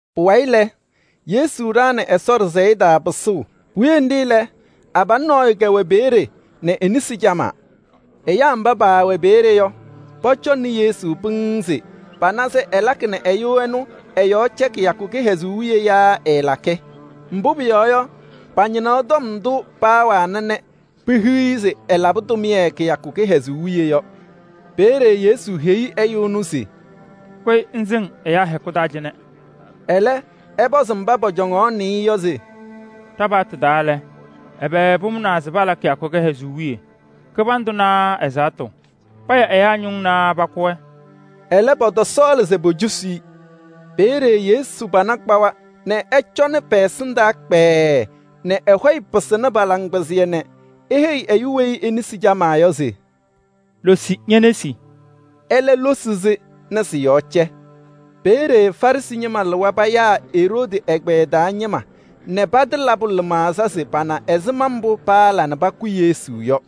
Pʋwayɩ lɛ, Yesu ɖaɣnɩ Ɛsɔ ɖɩsɛyɛ taa pɩsʋʋ. Puwiye nɖɩ lɛ, abalʋ nɔɔyʋ kɛwɛ peeye, e-nesi camaa. Ɛyaa mba paawɛ peeye yɔ, pɔcɔŋnɩ Yesu pɩŋŋ se pana se ɛlakɩ nɛ ɛyʋ ɛnʋ ɛ-yɔɔ cɛ kɩyakʋ kɩhɛzʋʋ wiye yaa ɛɛlakɩ? Mbʋ pʋyɔɔ yɔ, pañɩnaɣ tɔm ndʋ paawana nɛ pehiɣ-i se ɛlabɩ tʋmɩyɛ kɩyakʋ kɩhɛzʋʋ wiye yɔ. Peeye Yesu heyi ɛyʋ ɛnʋ se: “Kʋyɩ ŋsɩŋ ɛyaa hɛkʋ taa cɩnɛ!” Ɛlɛ, ɛpɔzɩ mba pɔcɔŋaɣnɩ-ɩ yɔ se: “Ɖa-paɣtʋ taa lɛ, ɛbɛ pʋmʋnaa se pala kɩyakʋ kɩhɛzʋʋ wiye? Kɩbandʋ naa ɛzaɣtʋ? Paya ɛyaa ñʋŋ naa pakʋ-wɛ?” Ɛlɛ, pɔtɔsɔɔlɩ se pocosi-i. Peeye Yesu pana kpawa nɛ ɛcɔnɩ pɛ-ɛsɩndaa kpɛɛɛ nɛ ɛ-hɔyɛ pɩsɩnɩ pa-laŋkpɩzɩyɛ nɛ eheyi ɛyʋ weyi e-nesi camaa yɔ se: “Losi ñe-nesi.” Ɛlɛ losi-sɩ nɛ sɩ-yɔɔ cɛ. Peeye Farɩsɩ ñɩma lɩwa payaa Eroodi ɛgbɛyɛ taa ñɩma nɛ patɩlabʋ lɩmaɣza se pana ɛzɩma mbʋ paala nɛ pakʋ Yesu yɔ.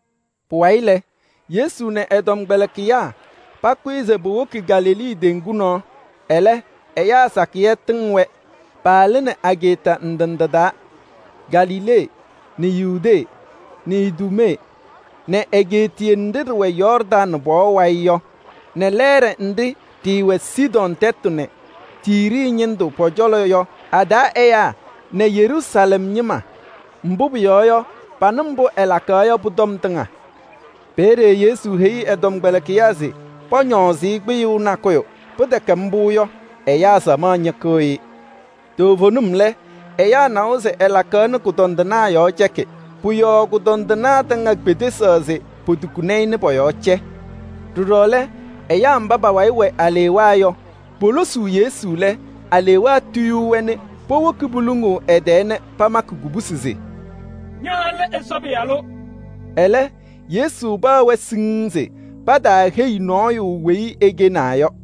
Pʋwayɩ lɛ, Yesu nɛ ɛ-tɔmkpɛlɩkɩyaa pakʋyɩ se powoki Galilee teŋgu nɔɔ, ɛlɛ ɛyaa sakɩyɛ tɩŋ-wɛ. Paalɩnɩ ageeta ndɩ ndɩ taa: Galilee nɛ Yudee nɛ Iduumee nɛ egeetiye nɖɩ ɖɩwɛ Yɔɔrdaŋ pɔɔ wayɩ yɔ nɛ lɛɛɖɛ nɖɩ ɖɩwɛ Sidɔɔ tɛtʋ nɛ Tiiri ñɩndʋ pɔ-cɔlɔ yɔ a-taa ɛyaa nɛ Yeruusalɛm ñɩma. Mbʋ pʋyɔɔ yɔ, panɩ mbʋ ɛlakaɣ yɔ pʋ-tɔm tɩŋa. Peeye Yesu heyi ɛ-tɔmkpɛlɩkɩyaa se pɔñɔɔzɩ-ɩ kpɩyʋʋ nakʋyʋ. Pɩtɛkɛ mbʋ yɔ, ɛyaa samaɣ ñɩkɩɣ-ɩ. Toovenim lɛ, ɛyaa nawa se ɛlakaɣ nɛ kʋdɔndɩnaa yɔɔ cɛkɩ. Pʋ-yɔɔ kʋdɔndɩnaa tɩŋa kpedesaɣ se potukuni-i nɛ pɔ-yɔɔ cɛ. Ɖɔɖɔ lɛ, ɛyaa mba pa-wayɩ wɛ alewaa yɔ, polosuu Yesu lɛ, alewaa tuyuu-wɛ nɛ powoki poluŋuu ɛ-tɛɛ nɛ pamakɩ kubusi se: “Ña lɛ Ɛsɔ Pɩyalʋ.” Ɛlɛ, Yesu paɣ-wɛ siŋŋ se pataaheyi nɔɔyʋ mbʋ ɛkɛnaa yɔ.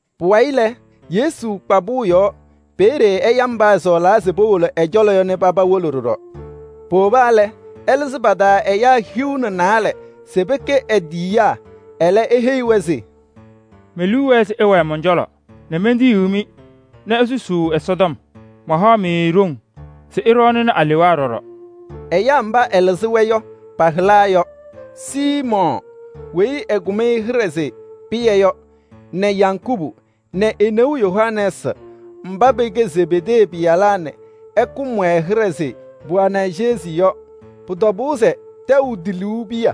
Pʋwayɩ lɛ, Yesu kpa pʋʋ yɔɔ. Peeye ɛya mba ɛsɔɔlaa se powolo ɛ-cɔlɔ yɔ nɛ paba wolo ɖɔɖɔ. Powoba lɛ, ɛlɩzɩ pa-taa ɛyaa hiu nɛ naalɛ se pɛkɛ e-tiyiyaa. Ɛlɛ, eheyi-wɛ se: “Me-liu wɛɛ se ɩwɛɛ mɔn-cɔlɔ nɛ mentiyiɣ-mɩ nɛ isusuu Ɛsɔtɔm. Mahaɣ-mɩ ɖoŋ se ɩɖɔɔnɩ alewaa ɖɔɖɔ.” Ɛyaa mba ɛlɩzɩ-wɛ yɔ, pa-hɩla yɔ: Siimɔɔ weyi ɛkʋm-ɩ hɩɖɛ se Pɩyɛ yɔ nɛ Yakubu nɛ e-neu Yohanɛɛsɩ mba pɛkɛ Zebedee pɩyalaa nɛ ɛkʋm-wɛ hɩɖɛ se Boanɛrjɛsɩ yɔ. Pʋ-tɔbʋʋ se tɛʋ tiluu piya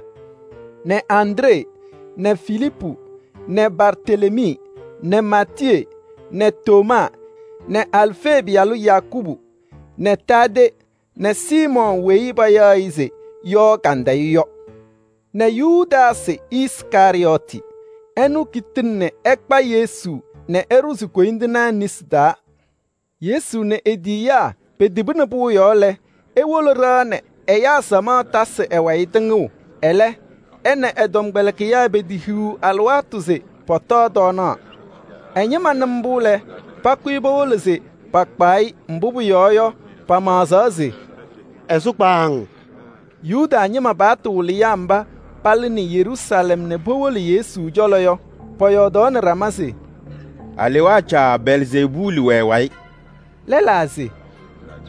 nɛ Andree nɛ Filiipu nɛ Bartelemii nɛ Maatiyee nɛ Tomaa nɛ Alfee pɩyalʋ Yakubu nɛ Taadee nɛ Siimɔɔ weyi payaɣ se Yɔɔ Kandɩyʋ yɔ nɛ Yudaasɩ Iskarɩyɔɔtɩ. Ɛnʋ kitini ɛkpa Yesu nɛ ɛɖʋzɩ koyindinaa nesi taa. Yesu nɛ e-tiyiyaa petibini pʋʋ yɔɔ lɛ, ewolo ɖɩɣa nɛ ɛyaa samaɣ tasɩ ɛ-wayɩ tɩŋʋʋ. Ɛlɛ, ɛ nɛ ɛ-tɔmkpɛlɩkɩyaa petehiɣ alɩwaatʋ se pɔtɔɔ tɔɔnaɣ. Ɛ-ñɩma nɩ mbʋ lɛ, pakʋyɩ powolo se pakpaɣ-ɩ. Mbʋ pʋyɔɔ yɔ, pamaɣzaɣ se: “Ɛsʋ kpaaŋ.” Yuda ñɩma paɣtʋ wɩlɩyaa mba palɩnɩ Yeruusalɛm nɛ powolo Yesu cɔlɔ yɔ, pɔyɔɔdaɣnɩ ɖama se: “Alewaa caa Belzeebuuli wɛ ɛ-wayɩ.” Lɛlaa se: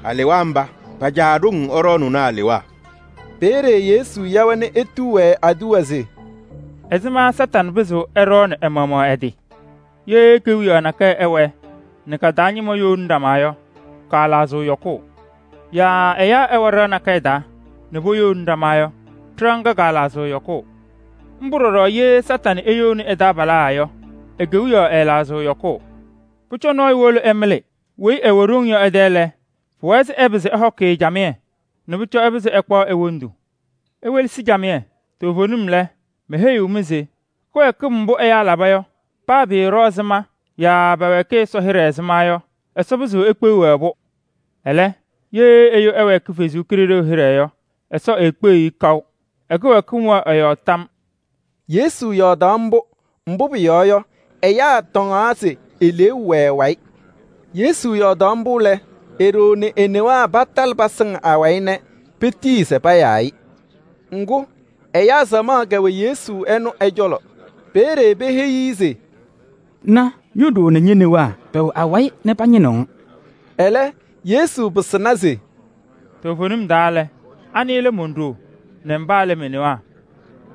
“Alewaa mba pa-caa ɖoŋ ɛɖɔɔnʋʋnɩ alewaa.” Peeye Yesu ya-wɛ nɛ etuu-wɛ aduwa se: “Ɛzɩma Kañadʋ Satanɩ pɩzɩɣ ɛɖɔɔnɩ ɛ-maɣmaɣ ɛ-tɩ? Ye kewiyaɣ nakɛyɛ ɛwɛɛ nɛ ka-taa ñɩma youni ɖama yɔ, kaalaɣzɩɣ yɔkʋʋ. Yaa ɛyaa ɛwɛ ɖɩɣa nakɛyɛ taa nɛ poyouni ɖama yɔ, ɖɩɣa ŋga kaalaɣzɩɣ yɔkʋʋ. Mbʋ ɖɔɖɔ ye Kañadʋ Satanɩ eyouni ɛ-taabalaa yɔ, e-kewiyaɣ ɛɛlaɣzɩɣ yɔkʋʋ. Pʋcɔ nɔɔyʋ wolo ɛmɩlɩ weyi ɛwɛ ɖoŋ yɔ ɛ-tɛ lɛ, pʋwɛɛ se ɛpɩzɩ ɛhɔkɩ-ɩ camɩyɛ nɛ pʋcɔ ɛpɩzɩ ɛkpaɣ e-wondu. Iwelesi camɩyɛ, toovenim lɛ, meheyiɣ-mɩ se kɩwɛɛkɩm mbʋ ɛyaa laba yɔ, paa pɩɩɖɔ ɛzɩma yaa pɛwɛɛkɩ Ɛsɔ hɩɖɛ ɛzɩma yɔ, Ɛsɔ pɩzɩɣ ekpeɣ-wɛ. Ɛlɛ, ye ɛyʋ ɛwɛɛkɩ Ɛsɔ Kalɩzaɣ hɩɖɛ yɔ, Ɛsɔ eekpeɣiɣ-i kaʋ: ɛ-kɩwɛɛkɩm wɛɣ ɛ-yɔɔ tam.” Yesu yɔɔdaɣ mbʋ, mbʋ pʋyɔɔ yɔ, ɛyaa tɔŋaɣ se eleeu wɛ ɛ-wayɩ. Yesu yɔɔdaɣ mbʋ lɛ, e-ɖoo nɛ e-newaa patalɩ pasɩŋ awayɩ nɛ petiyi se payaa-ɩ. Ŋgʋ, ɛyaa samaɣ kɛwɛ Yesu ɛnʋ ɛ-cɔlɔ. Peeye peheyi-i se: “Na, Ño-ɖoo nɛ ñe-newaa pɛwɛ awayɩ nɛ pañɩnɩɣ-ŋ.” Ɛlɛ, Yesu pɩsɩna se: “Toovenim taa lɛ, anɩ lɛ mon-ɖoo nɛ mba lɛ me-newaa?”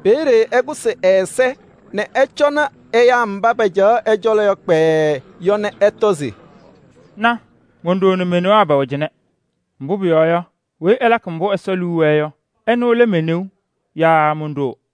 Peeye ɛkʋsɩ ɛ-ɛza nɛ ɛcɔnɩ ɛyaa mba pacaɣ ɛ-cɔlɔ kpɛɛɛ yɔ nɛ ɛtɔ se: “Na! Mon-ɖoo nɛ me-newaa pɛwɛnɩ cɩnɛ! Mbʋ pʋyɔɔ yɔ, weyi ɛlakɩ mbʋ Ɛsɔ liu wɛɛ yɔ, ɛnʋ lɛ me-neu yaa mon-ɖoo.”